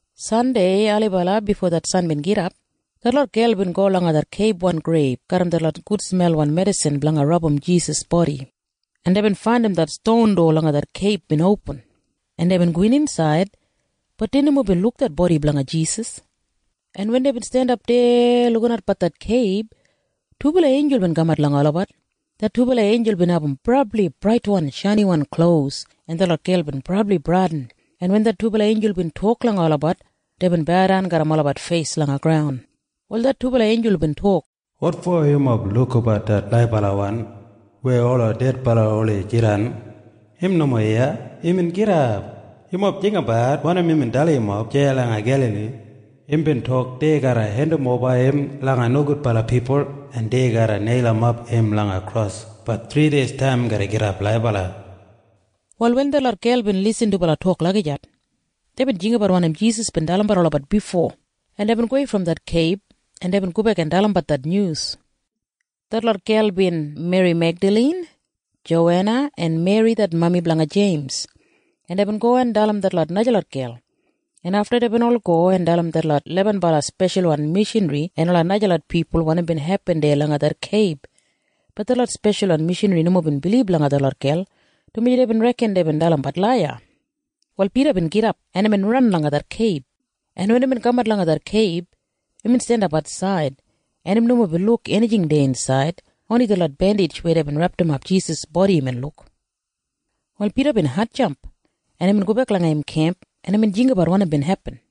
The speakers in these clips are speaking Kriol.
Sandei ailibala bifo det san bin gidap, detlot gel bin go langa det keibwan greib garram detlot gudsmelwan medisin blanga rabum Jisas bodi, en deibin faindim det ston dowa langa det keib bin opin, en deibin gowin insaid. Bat dei nomo bin luk det bodi blanga Jisas. En wen deibin jandap deya lukinatbat det keib, dubala einjul bin kamat langa olabat. Det dubala einjul bin abum brabli braitwan shainiwan klos, en detlot gel bin brabli bradin, en wen det dubala einjul bin tok langa olabat, deibin baudan garram olabat feis langa graun. Wal det dubala einjul bin tok, “Wotfo yumob lukabat det laibalawan weya ola dedbala oldei jidan? Im nomo iya! Imbin gidap! Yumob jinggabat wanim imbin dalim yumob deya langa Gelali. Imbin tok dei garra hendimoba im langa nogudbala pipul, en dei garra neilimap im langa kros. Bat thrideistaim im garra gidap laibala.” Wal wen detlot gel bin irrim dubala tok lagijat, deibin jinggabat wanim Jisas bin dalimbat olabat bifo, en deibin gowei brom det keib, en deibin gobek en dalimbat det nyus. Detlot gel bin Meri Megdalin, Jowena, en Meri det mami blanga Jeims. En deibin go en dalim detlot najalot gel, en afta deibin ol go en dalim detlot lebenbala speshalwan mishanri en ola najalot pipul wanim bin hepin deya langa det keib. Bat detlot speshalwan mishanri nomo bin bilib langa detlot gel, dumaji deibin reken deibin dalimbat laiya. Wal Pida bin gidap, en imbin ran langa det keib, en wen imbin kamat langa det keib, imbin jandap atsaid, en im nomo bin luk enijing deya insaid. Oni detlot bendij weya deibin repdimap Jisas bodi imbin luk. Wal Pida bin hatjamp, en imbin gobek langa im kemp, en imbin jinggabat wanim bin hepin.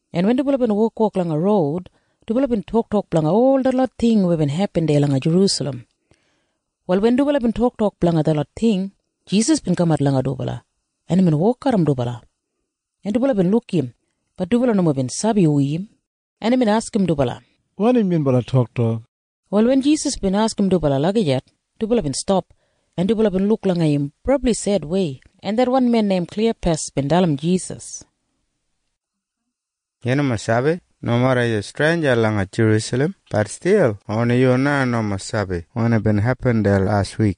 en wen dubala bin wokwok langa roud, dubala bin toktok blanga ol detlot ting weya bin hepin deya langa Jerusalem. Wal wen dubala bin toktok blanga detlot ting, Jisas bin kamat langa dubala, en imbin wok garram dubala, en dubala bin luk im. Bat dubala nomo bin sabi hu im. En imbin askim dubala, “Wanim yunbala toktok?” Wal wen Jisas bin askim dubala lagijat, dubala bin stap, en dubala bin luk langa im brabli sedwei, en det wan men neim Kliyapas bin dalim Jisas, “Yu nomo sabi? Nomeda yu streinja langa Jerusalem, bat stil oni yu na nomo sabi wanim bin hepin deya las wik!”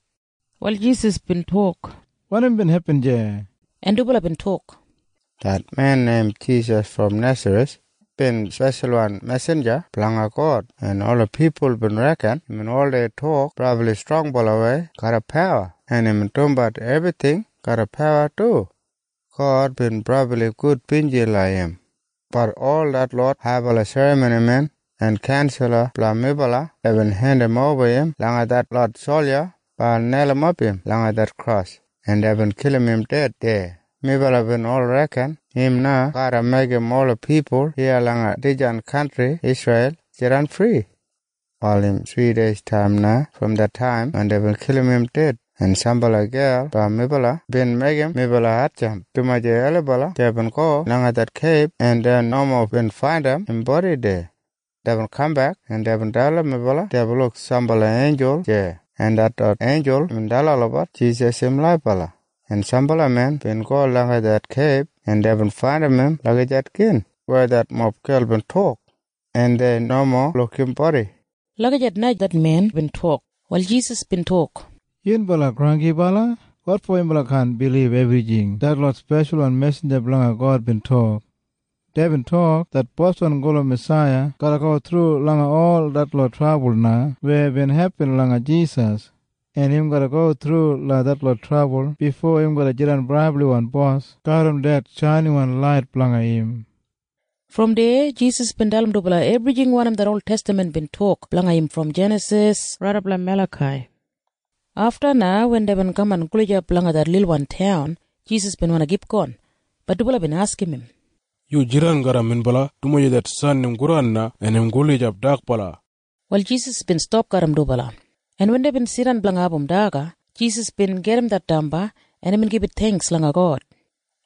Wal Jisas bin tok, “Wanim bin hepin deya?” En dubala bin tok, “Det men neim Jisas brom Nesareth bin speshalwan mesinja blanga God, en ola pipul bin reken imbin oldei tok brabli strongbalawei garram pawa, en imbin dumbat ebrijing garram pawa du, en God bin brabli gudbinji langa im. Bat ol detlot haibala serramonimen en kaunsala blanga melabat bin hendimoba im langa detlot solja blanga neilimap im langa det kros, en deibin kilim im ded deya. Melabat bin ol reken im na garra meigim ola pipul iya langa dijan kantri Isreil jidan fri. “Wal im thrideistaim na brom det taim wen deibin kilim im ded, en sambala gel blanga melabat bin meigim melabat hatjamp, dumaji ailibala deibin go langa det keib, en dei nomo bin faindim im bodi deya. Deibin kambek, en deibin dalim melabat deibin luk sambala einjul deya, en detlot einjul bin dalim olabat Jisas im laibala. En sambala men bin go langa det keib, en deibin faindim im lagijat gin weya detlot gel bin tok, en dei nomo bin luk im bodi.” Lagijat na det men bin tok. Wal Jisas bin tok, “Yunbala granggibala! Wotfo yunbala kaan bilib ebrijing detlot speshalwan mesinja blanga God bin tok? Deibin tok det Boswan gulum Masaiya garra go thru langa ol detlot trabul na weya bin hepin langa Jisas, en im garra go thru langa detlot trabul bifo im garra jidan brabliwan bos garram det shainiwan lait blanga im.” Brom deya Jisas bin dalim dubala ebrijing wanim det oltestaman bin tok blanga im brom Jenasis raidap langa Melakai. Afta na wen deibin kaman gulijap langa det lilwan taun, Jisas bin wandi kipgon. Bat dubala bin askim im, “Yu jidan garram minbala, dumaji det san im godan na, en im gulijap dakbala.” Wal Jisas bin stap garram dubala, en wen deibin jidan blanga abum daga, Jisas bin gajim det damba, en imbin gibit theingks langa God,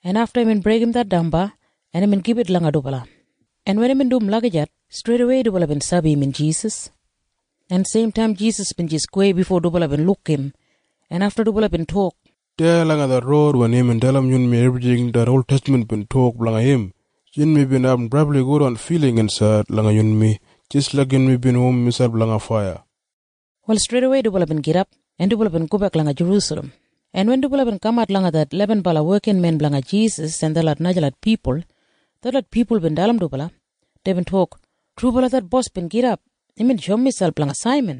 en afta imbin breigim det damba, en imbin gibit langa dubala. En wen imbin dum lagijat, streidawei dubala bin sabi imbin Jisas. En seimtaim Jisas bin jis gowei bifo dubala bin luk im, en afta dubala bin tok, “Deya langa det roud wen imbin dalim yunmi ebrijing det oltestaman bin tok blanga im, yunmi bin abum brabli gudwan filing insaid langa yunmi jis laik yunmi bin womim miselp langa faiya.” Wal streidawei dubala bin gidap, en dubala bin gobek langa Jerusalem, en wen dubala bin kamat langa det lebenbala wekinmen blanga Jisas en detlot najalot pipul, detlot pipul bin dalim dubala. Deibin tok, “Trubala det bos bin gidap! Imbin shoum miselp langa Saiman!”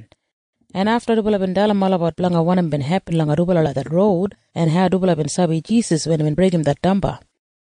En afta dubala bin dalim olabat wanim bin hepin langa dubala langa det roud en hau dubala bin sabi Jisas wen imbin breigim det damba.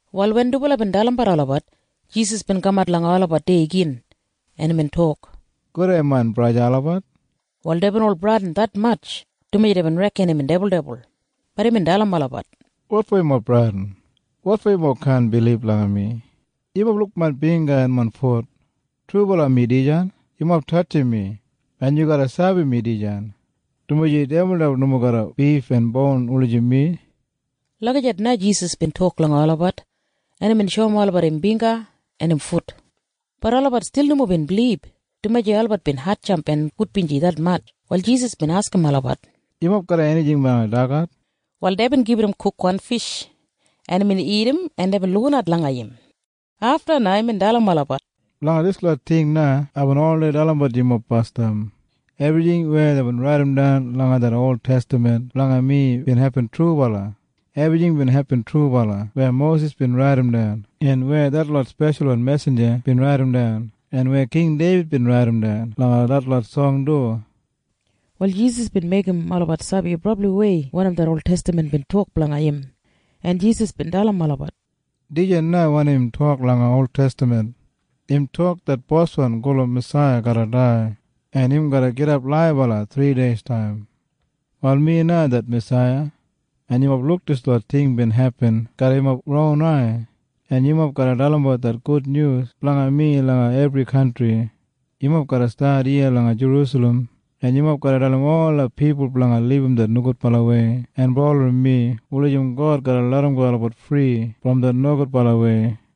Wal wen dubala bin dalimbat olabat, Jisas bin kamat langa olabat deya gin, en imbin tok, “Gudei main braja olabat.” Wal deibin ol bradin detmatj, dumaji deibin reken imbin dibuldibul. Bat imbin dalim olabat, “Wotfo yumob bradin? Wotfo yumob kaan bilib langa mi? Yumob luk main bingga en main fut. Trubala mi dijan! Yumob tatjim mi en yu garra sabi mi dijan, dumaji dibuldibul nomo garram bif en boun wulijim mi.” Lagijat na Jisas bin tok langa olabat. En imbin shoum olabat im bingga en im fut. Bat olabat stil nomo bin bilib, dumaji olabat bin hatjamp en gudbinji detmatj. Wal Jisas bin askim olabat, “Yumob garram enijing blanga dagat?” Wal deibin gibit im kukwan fish, en imbin dagat en deibin lukinat langa im. Afta na imbin dalim olabat, “Blanga dislot ting na aibin oldei dalimbat yumob basdam. Ebrijing weya deibin raidimdan langa det oltestaman blanga mi bin hepin trubala. Ebrijing bin hepin trubala weya Mosis bin raidimdan en weya detlot speshalwan mesinja bin raidimdan en weya King Deibid bin raidimdan langa detlot song du.” Wal Jisas bin meigim olabat sabi brabliwei wanim det oltestaman bin tok blanga im, en Jisas bin dalim olabat, “Dijan na wanim im tok langa oltestaman. Im tok det Boswan gulum Masaiya garra dai, en im garra gidap laibala thrideistaim. “Wal mi na det Masaiya, en yumob bin luk dislot ting bin hepin garram yumob ron ai, en yumob garra dalimbat det gudnyus blanga mi langa ebri kantri. Yumob garra stat iya langa Jerusalem, en yumob garra dalim ola pipul blanga libum det nogudbalawei en bulurrum mi wulijim God garra larramgo olabat fri brom det nogudbalawei.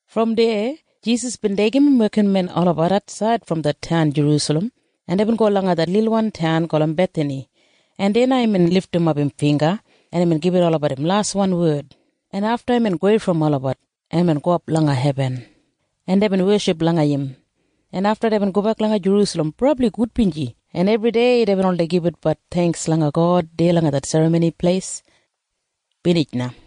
Brom deya Jisas bin deigim im wekinmen olabat atsaid brom det taun Jerusalem, en deibin go langa det lilwan taun gulum Bethani, en deya na imbin lidimap im bingga, en imbin gibit olabat im laswan wed, en afta imbin gowei brom olabat, en imbin gowap langa hebin, en deibin weship langa im, en afta deibin gobek langa Jerusalem brabli gudbinji, en ebridei deibin oldei gibitbat theingks langa God deya langa det Serramoni Pleis. Binij na.